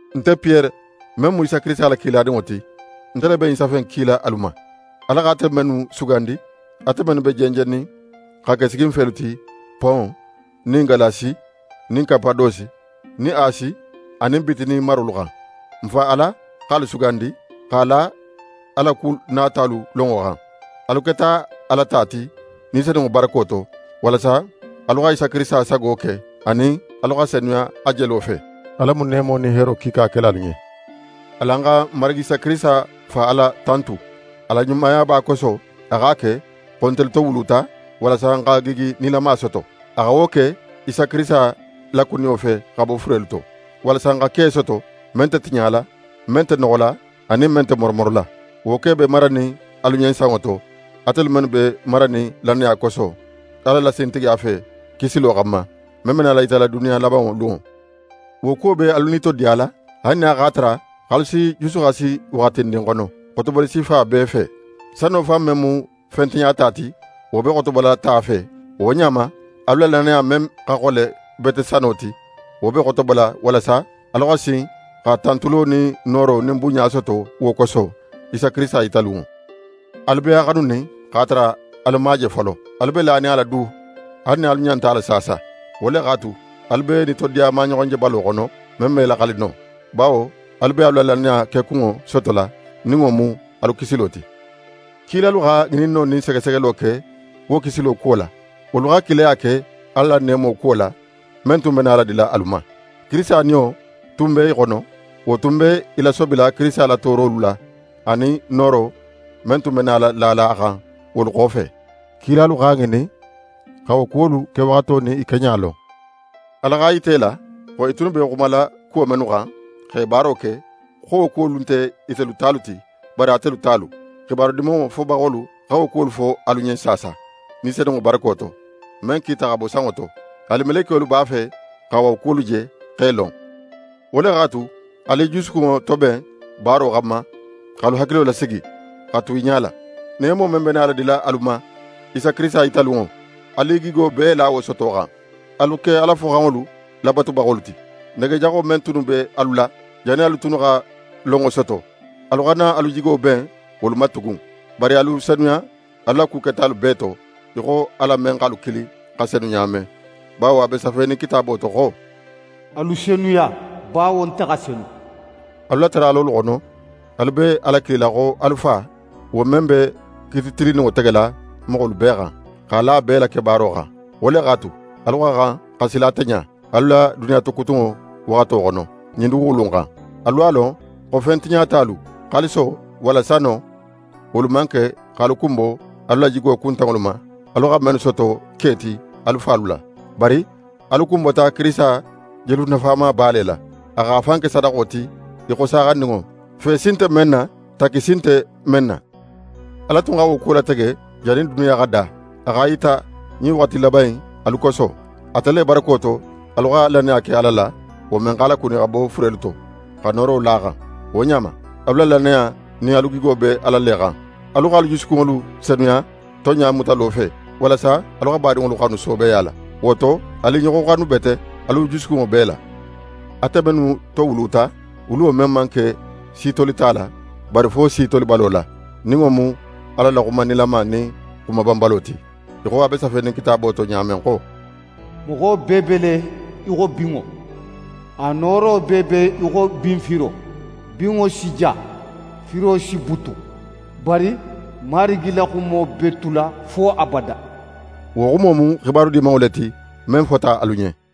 Nte Piyere men mu Isa Kirisita la kiladinŋo ti, nte le be ɲin safe in kila alu ma, Ala x'ate mennu sugandi, ate mennu be jenjennin xa ke siginfelu ti Pon nin Galasi nin Kapadosi nin Asi anin Bitini marolu xan. N Fa Ala x'alu sugandi, x'a la a la ku natalu lonŋo xan. Alu keta Ala ta ti Ni Senunŋo barako to, walasa alu xa Isa Kirisita sago ke, anin alu xa senuya a jelo fe. Ala mu neemo nin heero kiika kela alu ɲen. Alan xa n Marigi Isa Kirisita Fa Ala tantu! A la ɲumayaba koso, a x'a ke xo ntelu towuluta, walasa n xa gigi nilama soto. A xa wo ke Isa Kirisita lakuniyo fe xa bo furelu to, walasa n xa ke soto, men nte tiɲala, men nte noxola anin men nte moromorola. Wo ke be maranin alu ɲen sanŋo to, atelu mennu be maranin lannaya koso, Ala la sintigiya fe, kisilo xanma, men be nala yitala duniya labanŋo lunŋo. Wo kuwo be alu nitodiyala, haali nin a x'a tara x'alu si jusuxasi waxatindin xono, xotoboli sifa bee fe. Sano fan men mu fen tiɲata ti, wo be xotobola ta fe; wo ɲa ma, alu la lannaya men xa xole bete sano ti, wo be xotobola walasa alu xa sin xa tantulo nin nooro nin bunɲa soto wo koso, Isa Kirisita yitalunŋo. Alu be a xanunin x'a tara alu man a je folo. Alu be lanin a la du haali nin alu ɲa nte a la saasa. Wo le x'a tu, alu be nitodiya maɲoxonjebalo xono, men me laxali no, bawo alu be alu la lannaya kekunŋo sotola, nin wo mu alu kisilo ti. Kilalu xa ŋininno nin segesegelo ke wo kisilo kuwo la. Wolu xa kilaya ke Ala la neemo kuwo la, men tun be nala dila alu ma. Kirisita Niyo tun be i xono; wo tun be i lasobila Kirisita la toorolu la, anin nooro men tun be nala lala a xan wolu xofe. Kilalu x'a ŋinin xa wo kuwolu kewaxato nin i keɲa lon. Ala x'a yita i la, xo i tunnu be xumala kuwo mennu xan, x'e baaro ke, xo wo kuwolu nte itelu talu ti, bari atelu talu. xibaru Dimanŋo fobaxolu xa wo kuwolu fo alu ɲen saasa, Ni Senunŋo barako to, men kita xa bo sanŋo to. Haali melekiyolu b'a fe xa wo kuwolu je, x'e lon. Wo le x'a tu, alu i jusukunŋo toben baaro xanma, x'alu hakilo lasigi, xa tu i ɲala. Neemo men be nala dila alu ma Isa Kirisita yitalunŋo, alu i gigo bee la wo sotolo xan. Alu ke Ala foxanŋolu labatubaxolu ti. Nege jaxo men tunnu be alu la, jannin alu tunnu xa lonŋo soto, alu xana alu jigo ben wolu ma tugun. Bari alu senuya alu la ku ketalu bee to, í xo Ala men x'alu kili xa senu ɲa men, bawo a be safenin Kitaabo to xo: «Alu senuya bawo nte xa senu.» Alu la taralolu xono, alu be Ala kilila xo alu Fa, wo men be kiiti tilinninŋo tegela moxolu bee xan, x'a la bee la kebaaro xan. Wo le x'a tu, alu xa xan xa sila ate ɲa, alu la duniya tokutunŋo waxato xono, ɲin duguxulu in xan. Alu x'a lon xo fen tiɲatalu, xaaliso walla sano, wolu man ke x'alu kunbo alu la jigo kuntanŋolu ma, alu xa mennu soto ke ti alu falu la. Bari, alu kunbota Kirisita jelu nafamaba le la. A x'a fan ke sadaxo ti í xo saaxandinŋo, fe si nte men na, takki si nte men na. Ala tun xa wo kuwo latege jannin duniya xa da, a x'a yita ɲin waxati laban in, alu koso. Ate le barako to, alu xa lannaya ke Ala la, wo men x'a lakuni xa bo furelu to, xa nooro la a xan. Wo ɲa ma, alu la lannaya nin alu gigo be Ala le xan. Alu x'alu jusukunŋolu senuya tonɲa mutalo fe, walasa alu xa badinŋolu xanu soobeya la. Wo to, alu i ɲoxo xanu bete, alu jusukunŋo bee la, ate mennu towuluta, wuluwo men man ke si tolita la, bari fo si tolibalo la, nin wo mu Ala la xuma nilama nin xuma banbalo ti, í xo a be safenin Kitaabo to ɲa men xo: «Moxo bee be le í xo binŋo. A nooro bee be í xo binfiro; binŋo si ja, firo si butun. Bari Marigi la xumo be tula fo abada.» Wo xumo mu xibaru Dimanŋo le ti, men fota alu ɲen.